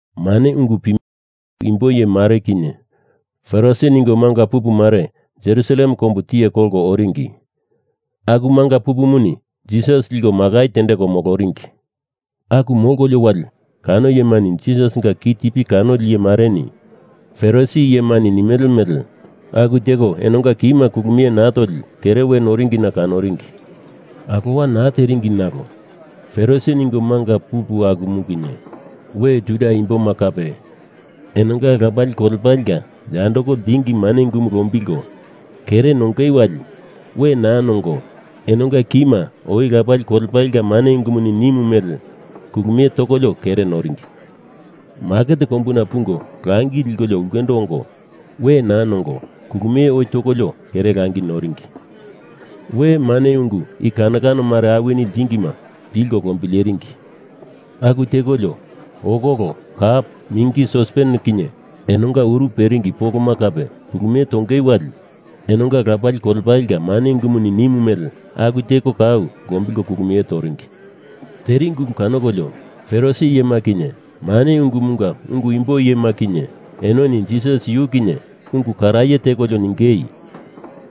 Mane ungu pimele ungu imbo iyemare kinye Farisi ningo manga pupumare Jerusalem kombu tiye kolko oringi. Aku manga pupumuni Jisas liko makai tendeko moloringi. Aku molkolio wali kano iyemani Jisasinga kitipi kanoli iyemareni Farisi iyemani nimele mele aku teko enonga kima kulumie naa toli kere we noringina kanoringi. (Alowa naa tenderingi nalo Farisi ningo manga pupu akuma kinye we Juda imboma kape enonga lapali kolepalenga yandoko ltingi mane ungumu lombilko kere nongei wali we naa nongo enonga kima oi lapali kolepalenga mane ungumuni nimu mele kulumie tokolio kere noringi. Maket kombuna pungo langi likolio ulkendo ongo we naa nongo kulumie oi tokolio kere langi noringi. We mane ungu i kano kano mare awini ltingima pilko lombileringi. Aku tekolio okolo, kap, mingi, sospenema kinye enonga uru peringi poloma kape kulumie tonge wali enonga lapali kolepalenga mane ungumuni nimu mele aku teko kau lombilko kulumie toringi.) Teringi ulu kanokolio Farisi iyema kinye mane ungumunga ungu imbo iyema kinye enoni Jisas yu kinye ungu karaye tekolio ningei,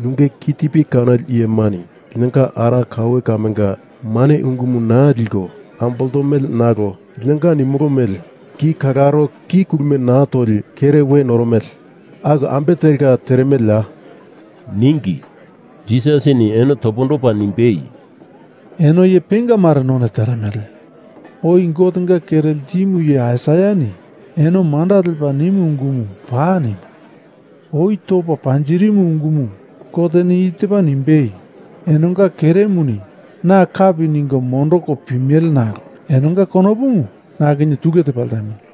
“Nunge kitipi kanoli iyemani linonga ara kaue kamenga mane ungumu naa liko amboltomele nalo linonga nimolo mele ki kalaro ki kulumie naa toli kere we noromele, aku ambe telka teremeleya,” ningi. Jisasini eno topondopa nimbei, “Eno iye penga mare none teremele. Oi Gotenga kere ltimu iye Aisaiani eno manda lepa nimu ungumu paa nimu. Oi topa panjirimu ungumu Goteni i tepa nimbei, Enonga keremuni na kapi ningo mondoko pimele nalo enonga konopumu na kinye tule tepa ltemo.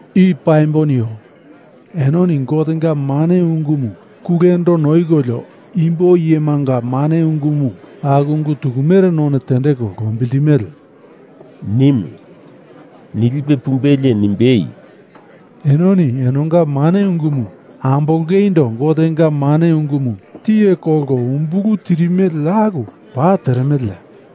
I paimbo nio. Enoni Gotenga mane ungumu kulendo noikolio imbo iyemanga mane ungumu aku ungu tukumere none tendeko lombiltimele,” nimu. Nilipe pumbelie nimbei, “Enoni enonga mane ungumu ambolongeindo Gotenga mane ungumu tiye kolko umbulu tirimele aku paa teremeleya?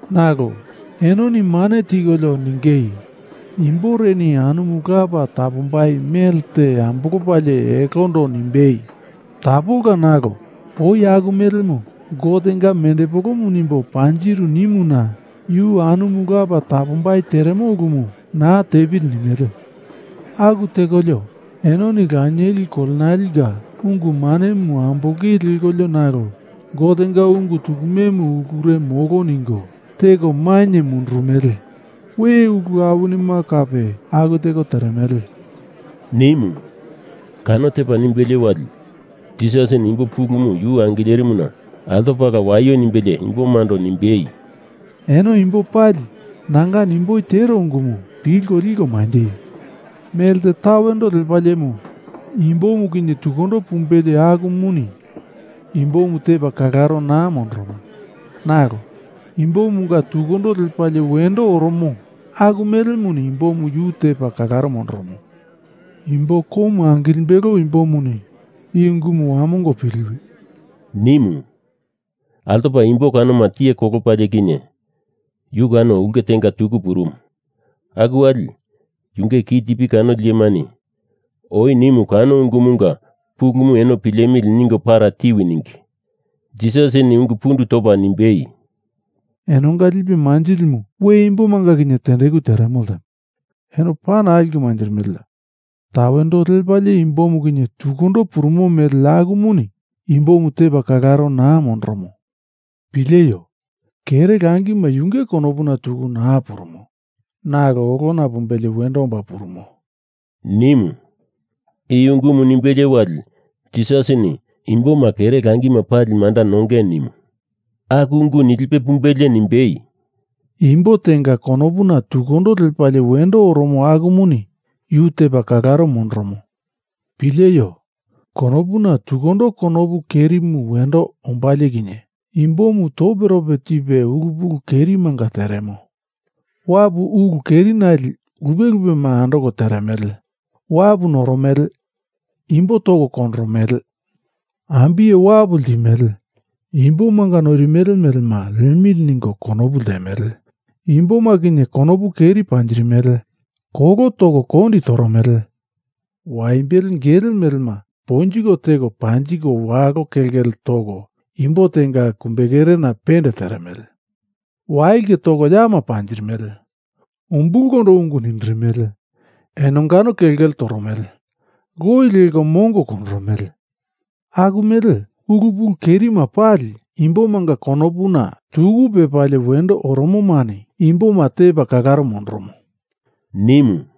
Nalo, enoni mane tikolio ningei imboreni anumu lapa tapombai mele te ambolopalie elondo nimbei, ‘Tapolka nalo oi aku melemu Gotenga mendepolomu nimbo panjiru,’ nimuna yu anumu lapa tapombai teremo ulumu naa tepili nimele. Aku tekolio enoni lanieli kolenalenga ungu manemu ambolongei lekolio nalo Gotenga ungu tukumemu ulure molo ningo teko mainye mundurumele. We ulu awinima kape aku teko teremele,” nimu. Kano tepa nimbelie wali, Jisasini imbo pulumu yu angilerimuna altopala waio nimbelie imbomando nimbei, “Eno imbo pali nanga nimboi tero ungumu pilko liko manjeio. Melte tawendo lepaliemu imbo tukundo pumbelie akumuni imbomu tepa kalaro naa mondoromo, nalo imbomunga tukundo lepalie wendo oromo, aku melemuni imbomu yu tepa kalaro mondoromo. Imbo komu angilimbelo imbomuni i ungumu wamongo piliwi,” nimu. Altopa imbo kanoma tiye kolopalie kinye, yu kano ulke tenga tuku purumu. Aku wali, yunge kitipi kanoli iyemani oi nimu kano ungumunga pulumu eno pilemili ningo para tiwi ningi. Jisasini ungu pundu topa nimbei, “Enonga lipe manjilimu we imbomanga kinye tendeku teremo ltemo. Eno paa naa liko manjirimeleya. Tawendo lepalie imbo tukundo purumo mele akumuni imbomu tepa kalaro naa mondoromo. Pileio! Kere langima yunge konopuna tuku naa purumo, nalo olona pumbelie wendo omba purumo,” nimu. I ungumu nimbelie wali Jisasini imboma kere langima pali manda nongei nimu. Aku ungu nilipe pumbelie nimbei, “Imbo tenga konopuna tukundo lepalie wendo oromo akumani yu tepa kalaro mondoromo. Pileio! Konopuna tukundo konopu kerimu wendo ombalie kinye imbomu toperope tipe ulu pulu kerimanga teremo. Wapu ulu keri nale lupe lupema andoko teremele. Wapu noromele. Imbo toko kondoromele. Ambiye wapu ltimele. Imbomanga noirimele melema liemilia ningo konopu ltemele. Imboma kinye konopu keri panjirimele. Kolo toko kondi toromele. Waimbele gele melema ponjiko teko panjiko walo kelkele toko imbo tenga kumbekerena pende teremele. Wailke toko yama panjirimele. Umbulkondo ungu nindirimele. Enongano kelkele toromele. Loi leko mongo kondoromele. Aku mele ulu pulu kerima pali, imbomanga konopuna tuku lepalie wendo oromomani imboma tepa kalaro mondoromo,” nimu.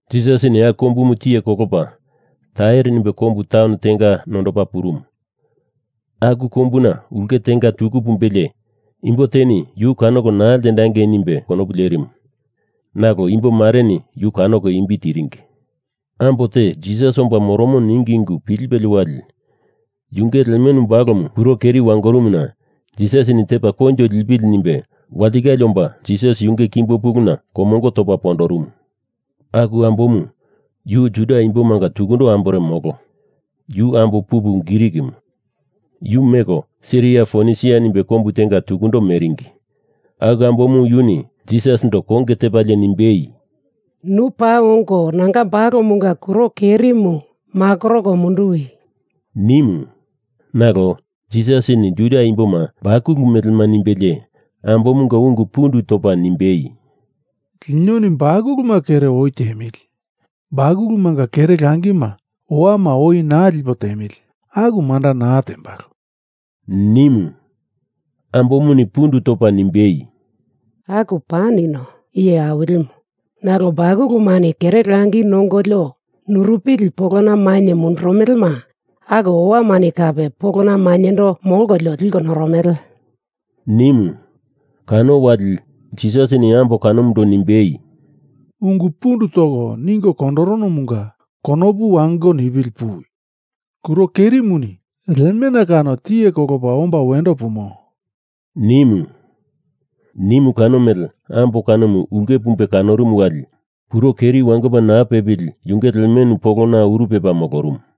Jisas aku kombumu tiye kolopa, Tair nimbe kombu taun tenga nondopa purumu. Aku kombuna ulke tenga tuku pumbelie imbo teni yu kanoko naa ltendangei nimbe konopu lerimu, nalo imbomareni yu kanoko imbi tiringi. Ambo te Jisas omba moromo ningi ungu pilipelie wali, yunge lemenu balomu kuro keri wangorumuna Jisasini tepa koinjo lipili nimbe walitikale omba Jisas yunge kimbo puluna komongo topa pondorumu. Aku ambomu yu Juda imbomanga tukundo ambore molo. Yu ambo pupu Grikimu. Yu meko Siria Fonisia nimbe kombu tenga tukundo meringi. Aku ambomu yuni Jisasindo konge tepalie nimbei, “Nu paa ongo, nanga balomunga kuro kerimu makoroko munduwi,” nimu. Nalo, Jisasini Juda imboma bakulu melema nimbelie ambomunga ungu pundu topa nimbei, “Linoni bakuluma kere oi tiemili. Bakulumanga kere langima owama oi naa lipo tiemili, aku manda naa tembalo,” nimu. Ambomuni pundu topa nimbei, “Aku pa nino, Iye Awilimu. Nalo bakulumani kere langi nongolio nurupili polona mainye mundurumelema aku owamani kape polona maindo molkolio liko noromele,” nimu. Kano wali, Jisasini ambo kanomundo nimbei, “Ungu pundu toko ningo kondoronomunga konopu wango nipili puwi. Kuro kerimuni lemena kano tiye kolopa omba wendo pumo,” nimu. Nimu kano mele ambo kanomu ulke pumbe kanorumu wali, kuro keri wangopa naa pepili yunge lemenu polona uru pepa molorumu.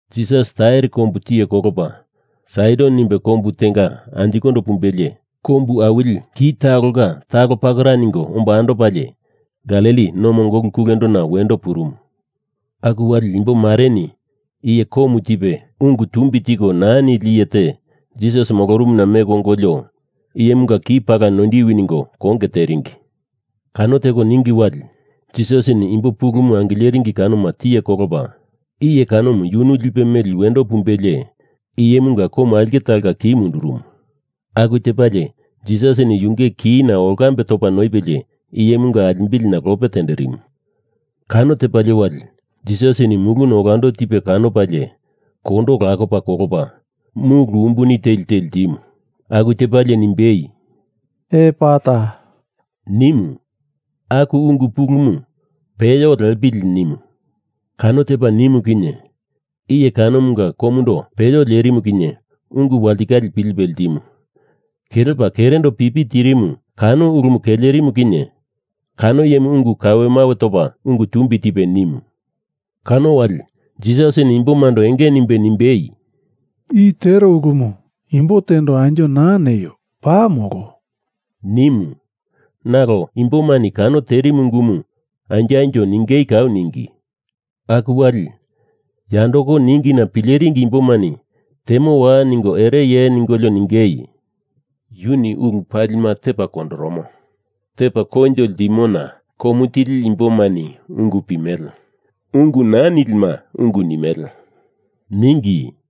Jisas Tair kombu tiye kolopa Saidon nimbe kombu tenga anjikondo pumbelie kombu awili ki talonga talo pakera ningo omba andopalie Galili no mongolu kulendona wendo purumu. Aku wali imbomareni iye komu tipe ungu tumbi tiko naa nili iye te Jisas molorumuna meko ongolio iyemunga ki pala noindiwi ningo konge teringi. Kano teko ningi wali, Jisasini imbo pulumu angileringi kanoma tiye kolopa iye kanomu yunu lipe meli wendo pumbelie iyemunga komu aulke talonga ki mundurumu. Aku tepalie Jisasini yunge kina olkambe topa noipelie, iyemunga alimbilina lope tenderimu. Kano tepalie wali, Jisasini muluna olando tipe kanopalie kondo lakopa kolopa mulu umbuni teli te ltimu. Aku tepalie nimbei, “Epata” nimu. Aku ungu pulumu peyo lepili nimu. Kano tepa nimu kinye, iye kanomunga komundo peyo lerimu kinye ungu walitikale pilipe ltimu. Kelepa kerendo pipi tirimu, kano ulumu kelerimu kinye kano iyemuni ungu kawemawe topa ungu tumbi tipe nimu. Kano wali, Jisasini imbomando enge nimbe nimbei, “I tero ulumu imbo tendo anjo naa neio. Paa molo,” nimu. Nalo, imbomani kano terimu ungumu anjo anjo ningei kau ningi. Aku wali, yandoko ningina pileringi imbomani temowa ningo ereye ningolio ningei, “Yuni ulu palima tepa kondoromo. Tepa koinjo ltimona komu tili imbomani ungu pimele, ungu naa nilima ungu nimele,” ningi.